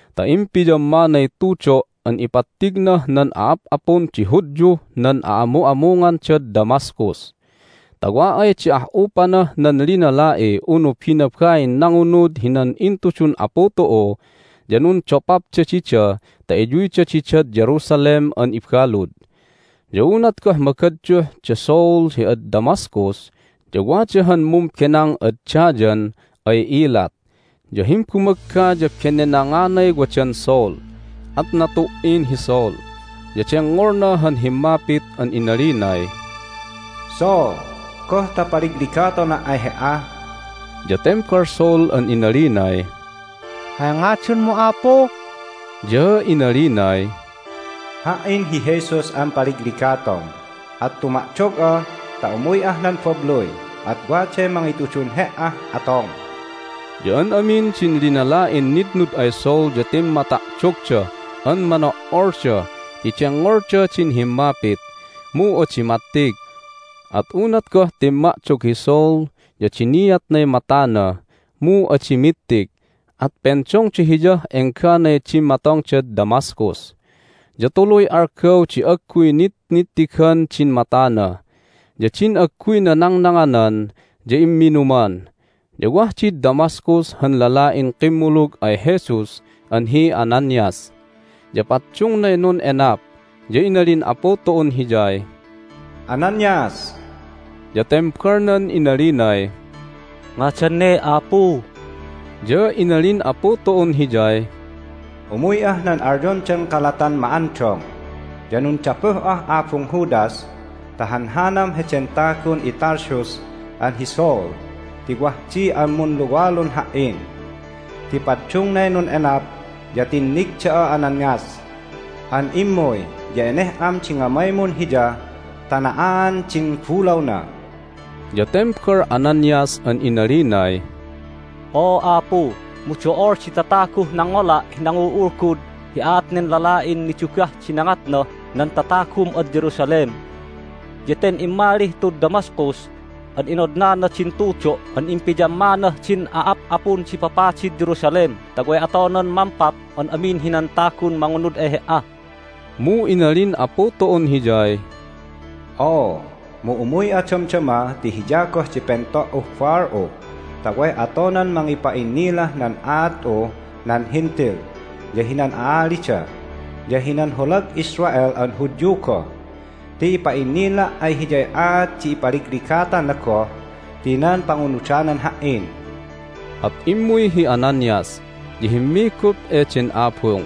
ta impiyammanay tudo' an ipattignah nan a'ap'apun di Hudyuh nan a'amu'amungandad Damascus, ta wa ay di ah'upanah nan linala'i unu binabain nangunud hinan intudun Apu tu'u ya nundopapda dida ta iyuyda didad Jerusalem an ibalud. Ya unat goh magadyuh da Saul hi ad Damascus ya wada han mumbenang ad dayan ay ilat, ya himbumagga ya benenanganay wadan Saul. At natu"in hi Saul, ya dengngolna han himmapit an inalinay, "Saul! Goh ta paligligatona' ay he"a?" Ya tembal Saul an inalinay, "Hay ngadanmu, Apu?" Ya inalinay, "Ha"in hi Jesus an paligligatom! At tuma'dog'a ta umuy'ah nan babluy, at waday mangitudun he"ah atom." Ya an amin din linala'in nitnud ay Saul ya timmata'dogda an mano'olda ti dengngolda din himmapit, mu adi mattig. At unat goh timma'dog hi Saul ya diniatnay matana, mu adi mittig, at pendongda hiyah engganay dimmatongdad Damascus. Ya tuluy algaw di agguy nitnittigan din matana, ya din agguyna nangnanganan ya imminuman. Ya wah did Damascus han lala'in kimmulug ay Jesus an hi Ananias. Ya paddungnay nun'enap, ya inalin Apu tu'un hiyay, "Ananias!" Ya tembalnan inalinay, "Ngadan ne, Apu?" Ya inalin Apu tu'un hiyay, "Umuy'ah nan alyondan Kalatan Ma'andong, ya nundapuh'ah abung Judas ta hanhanam heden tagun iTarsus an hi Saul ti wah di an munluwalun Ha"in. Ti paddungnay nun'enap, ya tinnig da'a, Ananias, an immuy, ya eneh'am di ngamaymun hiya ta na'aan din bulawna." Ya tembal Ananias an inalinay, "Oo, Apu, mu do'ol di tataguh nangngola' hi nangul'ulgud hi aat nen lala'in nidugah di nangatnah nan tatagum ad Jerusalem! Ya ten immalih tud Damascus an inodnana din tudo' an impiyammanah din a'ap'apun di papadid Jerusalem ta way atonan mampap an amin hinan tagun mangunud ay He"a!" Mu inalin Apu tu'un hiyay, "Oo, mu umuy'a damdama ti hiya goh di pento"uh baal'u ta way atonan mangipa'innilah nan aat'uh nan Hentil, ya hinan a'alida, ya hinan holag Israel an Hudyu goh ti ipa'innila' ay hiyay aat di ipaligligatana goh ti nan pangunudanan Ha"in." At immuy hi Ananias, ya himmigup eden abung,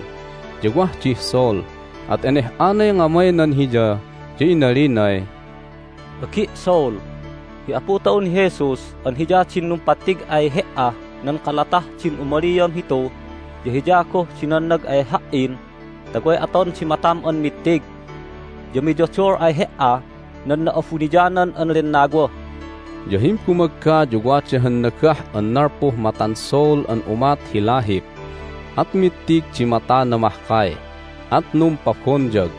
ya wah dih Saul, at eneh'anay ngamaynan hiya, ya inalinay, "Agi' Saul! Hi Apu tu'un hi Jesus an Hiya din numpattig ay he"ah nan kalatah din umaliam hitu ya Hiya goh di nannag ay ha"in ta way aton di matam an mittig, ya miyodol ay he"a nan Na'abuniyanan an Lennawa." Ya himbumagga ya wada han nagah an nalpuh matan Saul an umat hi lahip, at mittig di matana mahkay, at numpabonyag.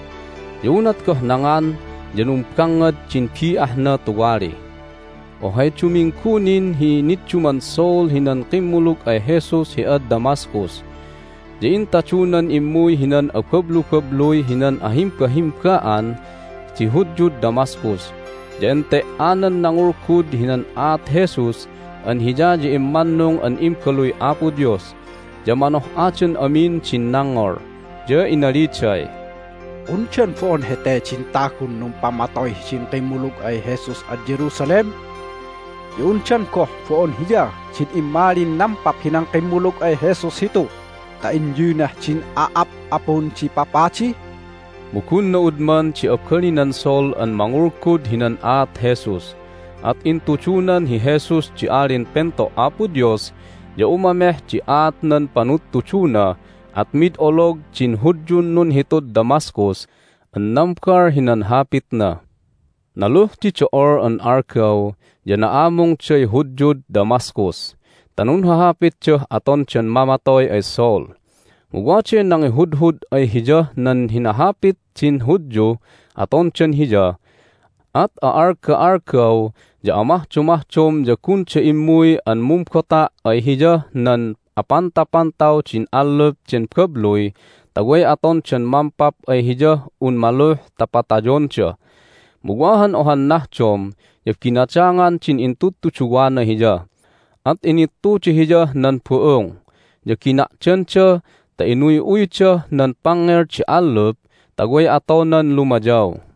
Ya unat goh nangan ya numbangngad din bi'ahna tuwali. Ohay duminggu nin hi nidduman Saul hinan kimmulug ay Jesus hi ad Damascus. Ya intadunan immuy hinan abablubabluy hinan ahimbahimba'an di Hudyud Damascus, ya ente"anan nangulgud hinan aat Jesus an Hiya ya immannung an Imbaluy Apo Dios! Ya manoh'adan amin din nangngol, ya inaliday, "Undan bo'on hete din tagun numpamatoy hidin kimmulug ay Jesus ad Jerusalem? Ya undan goh bo'on hiya din immalin nampap hinan kimmulug ay Jesus hitu ta inyuynah din a'ap'apun di papadi?" Mu gun na'udman di abalinan Saul an mangulgud hinan aat Jesus, at intudunan hi Jesus di Alin Pento' Apo Dios, ya umameh di aat nan panudtuduna, at mid olog din Hudyun nunhitud Damascus an nambal hinan hapitna. Naluh di do'ol an algaw ya na'amungday Hudyud Damascus ta nunhahapitdah atondan mamatoy ay Saul. Mu waday nangihudhud ay hiyah nan hinahapit din Hudyuh atondan hiya. At a'alga'algaw ya amahdomahdom ya gunda immuy an mumbota' ay hiyah nan apantapantaw din allup den babluy ta way atondan mampap ay hiyah un maluh ta patayonda. Mu wa han ohan nahdom ya binadangan din intudtuduwana hiya, at inittuda hiyah nan bu'ung, ya gina'danda ta inuy'uydah nan pangngel di allup ta way atonan lumayaw.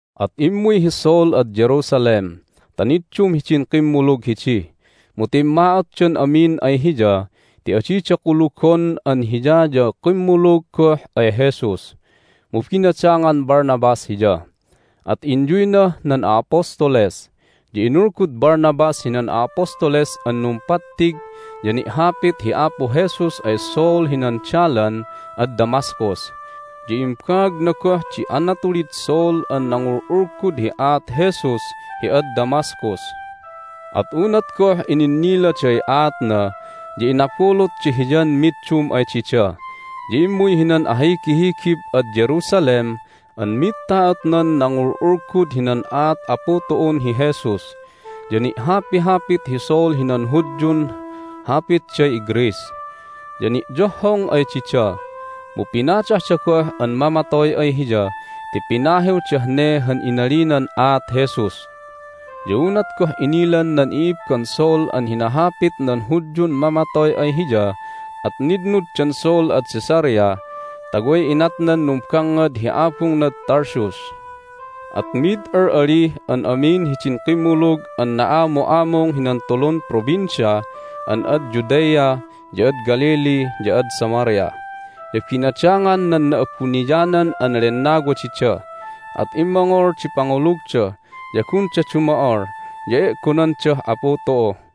At immuy hi Saul ad Jerusalem ta niddum hidin kimmulug hidi. Mu timma'otdan amin ay hiya ti adida kulugon an hiya ya kimmulug goh ay Jesus. Mu binadangan Barnabas hiya, at inyuynah nan a'apostoles. Ya inulgud Barnabas hinan a'apostoles an numpattig ya ni'hapit hi Apu Jesus ay Saul hinan dalan ad Damascus, ya imbaagna goh di anatulid Saul an nangul'ulgud hi aat Jesus hi ad Damascus. At unat goh ininniladay aatna ya inabulutda hiyan middum ay dida. Ya immuy hinan ahigihigib ad Jerusalem an mid ta'otnan nangul'ulgud hinan aat Apu tu'un hi Jesus. Ya ni'hapihapit hi Saul hinan Hudyun hapitday iGreece, ya ni'yohhong ay dida, mu pinadahda goh an mamatoy ay hiya ti pinahiwdah ne han inalinan aat Jesus. Ya unat goh inilan nan i'ibban Saul an hinahapit nan Hudyun mamatoy ay hiya at nitnuddan Saul ad Caesarea ta way inatnan numbangngad hi abungnad Tarsus. At mid al'alih an amin hidin kimmulug an na'amu'amung hinan tulun provincia an ad Judea, ya ad Galilee, ya ad Samaria. Ya binadangan nan Na'abuniyanan an Lennawa dida, at immongol di pangulugda, ya gunda dumo'ol, ya e'gonandah Apu tu'u.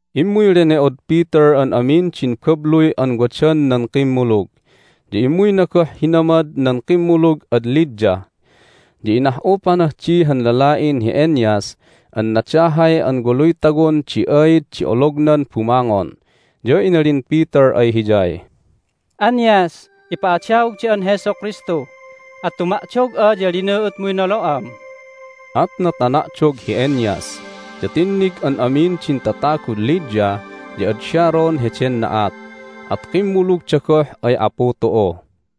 Immuy lene'od Peter an amin din babluy an wadan nan kimmulug, ya immuyna goh hinamad nan kimmulug ad Lydda. Ya inah'upanah di han lala'in hi Aeneas an nadahay an waluy tawon di aid di olognan bumangon. Ya inalin Peter ay hiyay, "Aeneas, ipa'adaog da'an Jesu Kristu! At tuma'dog'a, ya linu'utmuy nolo'am!" At natana'dog hi Aeneas. Ya tinnig an amin din tatagud Lydda ya ad Sharon heden na'at, at kimmulugda goh ay Apu tu'u.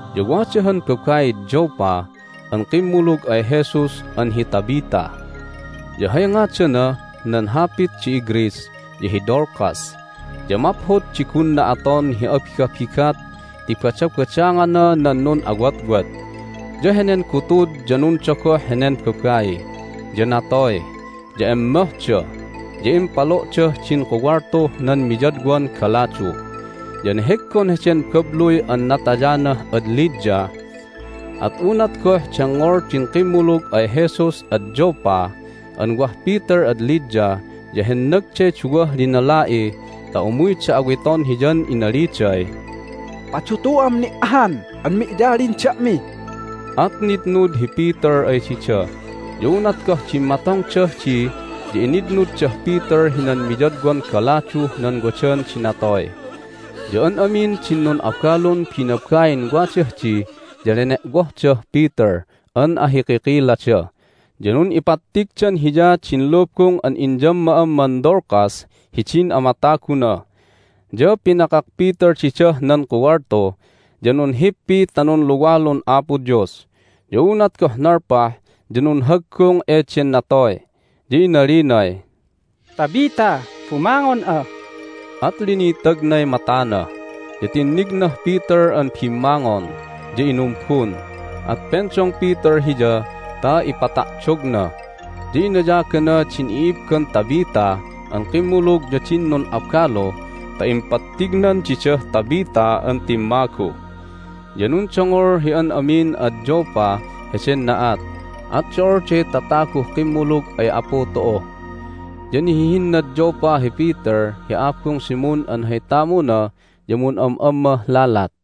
Ya wada han babaid Joppa an kimmulug ay Jesus an hi Tabitha, ya hay ngadanah nan hapit di iGreece ya hi Dorcas. Ya maphod di gunna aton hi abigabigat ti badabadangana nan nun'awotwot. Ya henen gutud ya nundogoh henen babai, ya natoy. Ya emmohda, ya impalo'dah din kuwaltuh nan miyadwan galadu. Ya neheggon heden babluy an natayanah ad Lydda. At unat goh dengngol din kimmulug ay Jesus ad Joppa an wah Peter ad Lydda ya hennagday duwah linala'i ta umuyda awiton hiyan inaliday, "Padutu'am ni' ahan an mi'yalin da'mi!" At nitnud hi Peter ay dida. Ya unat goh dimmatongdah di ya initnuddah Peter hinan miyadwan galaduh nan wadan di natoy. Ya an amin din nun'abalun binabain wadah di ya lene'wohdah Peter an ahikikilada, ya nun'ipattigdan hiya din lubung an inyamma'amman Dorcas hidin amataguna. Ya pinakak Peter didah nan kuwaltu, ya nunhippi ta nunluwalun Apo Dios. Ya unat goh nalpah ya nunhaggung eden natoy, ya inalinay, "Tabitha, bumangon'a!" At linitagnay matana, ya tinnignah Peter an bimmangon, ya inumbun. At pendong Peter hiya ta ipata'dogna. Ya inayagana din i'ibban Tabitha an kimmulug ya din nun'abalu ta impattignan didah Tabitha an timmagu. Ya nundongol hi an amin ad Joppa heden na'at, at do'olday tataguh kimmulug ay Apu tu'u. Ya nihihinnad Joppa hi Peter hi abung Simon an hay tamuna ya mun'am'ammah lalat.